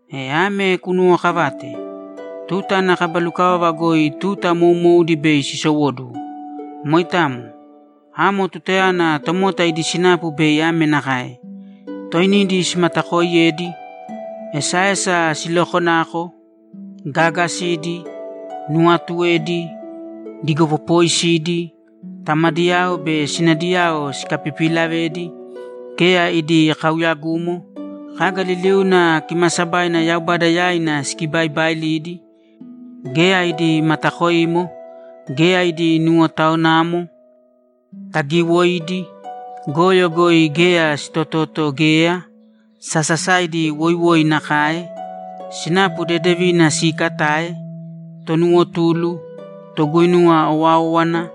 E ame kunuwookavāte: Tuta ana kaba lukavava goi tuta moumoudi bei sisowóduwo. Moitamo. Amo tutayana tomota idi sinapu bei ame nakae: Toinidi simatakooiyedi, esaesa silokonako, gaagasidi, nuwaatuedi, digopopooisidi, tamadiyao be sinadiyao sikapipilavedi, geya idi kauyagumo, kaga liliuna kimaasabaina Yaubada yaina sikibaibailidi, geya idi matakoimo, geya idi nuwotawanamo, tagiiwoidi, goyo goi geya sitototo geya, sasasaidi woiwoi nakae, sinapu dedevina siikatae, tonuwotulu, toguinuwa owáowana,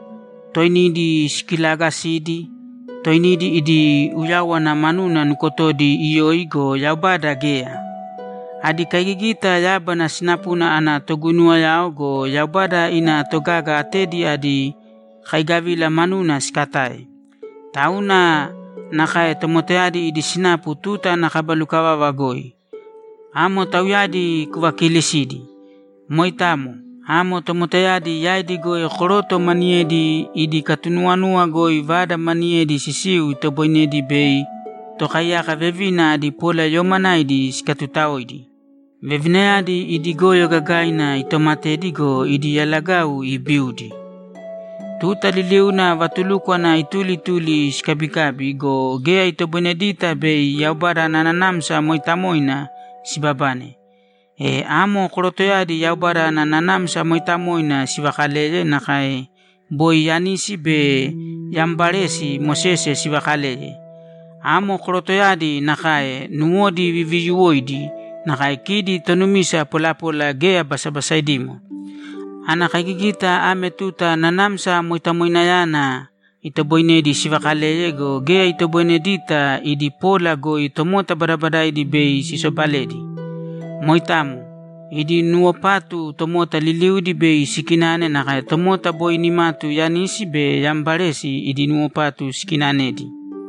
toinidi sikilaagasidi, toinidi idi uyáwana manuna nukotodi iyoi go, Yaubada geya. Adi kaigigita yábana sinapuna ana toguinuwao go, Yaubada ina togaga atedi adi kaigavila manuna sikatae. Tauna nakae tomotayadi idi sinapu tuta ana kaba lukavava goi. Amo tauyadi kuvakiilisīdi. Moitamo. Amo tomotayadi yaidi goi koroto maniyedi idi katunuwanuwa goi vada maniyedi sisiu itoboinedi bei tokaiyaka vevina adi polayoomanaidi sikatutaoidi. Vevinayadi idi goyo gagaina itomatedi go, idi yalagau ibiudi. Tuta liliuna vatulúkwana ituli ituli sikabikabi go, geya itoboinedita bei Yaubada ana Nanamsa Mooitamoina sibabane. E amo korotoyadi Yaubada ana Nanamsa Mooitamoina sivaakaleye nakae boi Yanisi be Yambaresi Mosese sivakaleye. Amo korotoyadi nakae, nuwodi viviyuwoidi nakae kidi tonumisa polapola geya basabasaidimo. Ana kaigigita ame tuta Nanamsa Moitamoinayana itoboinedi sivaakaleye go, geya itoboinedita idi pola goi tomota badabadaidi bei sisobaledi. Moitamo. Idi nuwopatu tomota liliudi bei sikinane nakae tomota boi nimatu Yanisi be Yambaresi idi nuwopatu sikinanedi.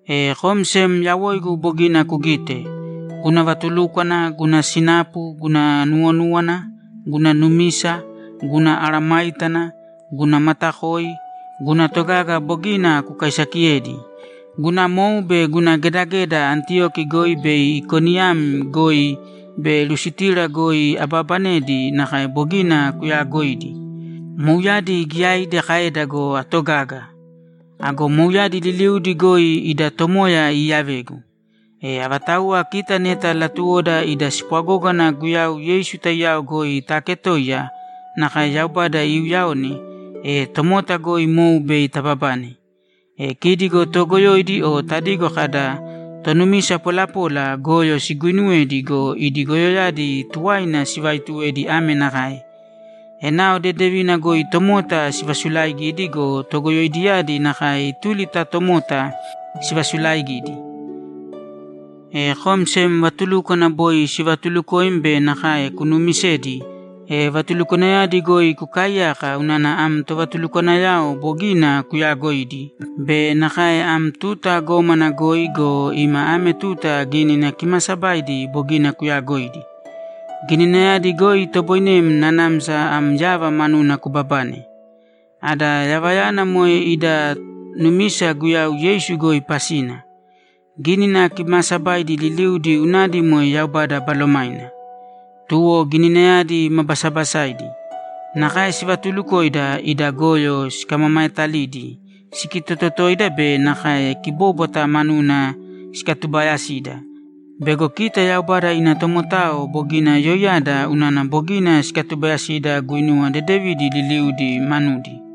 E kom sem yawoigu bogina kugite. Guna vatulúkwana, guna sinapu, guna nuwonúwana, guna numisa, guna mesayágana, guna matakoi, guna togaga bogina kukaisakiyedi. Guna mou be guna gedageda Antiyoki goi be Ikoniyam goi be Lustira goi abaabanedi nakae bogina kuyaagoidi. Mouyadi giyaidi kaeda go, atogaga. Ago mouyadi liliudi goi ida Tomoya iiyavegu. E avatauwa kita neta latuwoda ida spwagógana Guyau Yeisu taiyao goi taaketoiya nakae Yaubada iuuyaone, e tomota goi mou bei tababane. E kidi go toogoyoidi o tadigo kada, ‘Tonumisa polapola’ goyo siguuinuwedi go, idi goyoyadi tuwaina sivaituwedi ame nakae: Enao dedevina goi tomota sivasulaigidi go, togoyoidiyadi nakae ituli ta tomota sivasulaigidi. E kom sem vatulúkwana boi sivatuulukoim be nakae kunumisedi, e vatulukwanayadi goi kukaaiyāka unana am tovatulukwanayao bogina kuyaagoidi be nakae am tuta gómana goi go, ima ame tuta Gínina Kimaasabaidi bogina kuyagoidi. Gininayadi goi itoboinem nanamsa am yava manuna kubabane. Ada yavayana moe ida numisa Guyau Yeisu goi pasina. Gínina Kimaasabaidi liliudi unadi moe Yaubada Balomaina. Tuwo Gininayadi ma basabasaidi. Nakae sivatulukoida, ida goyo sikamamaetalidi, sikitototoida be nakae kibóbwata manuna sikatubayasida bego kita Yaubada ina tomotao bogina yoiyada unana bogina sikatubayasida guinuwa dedevidi liliudi manudi.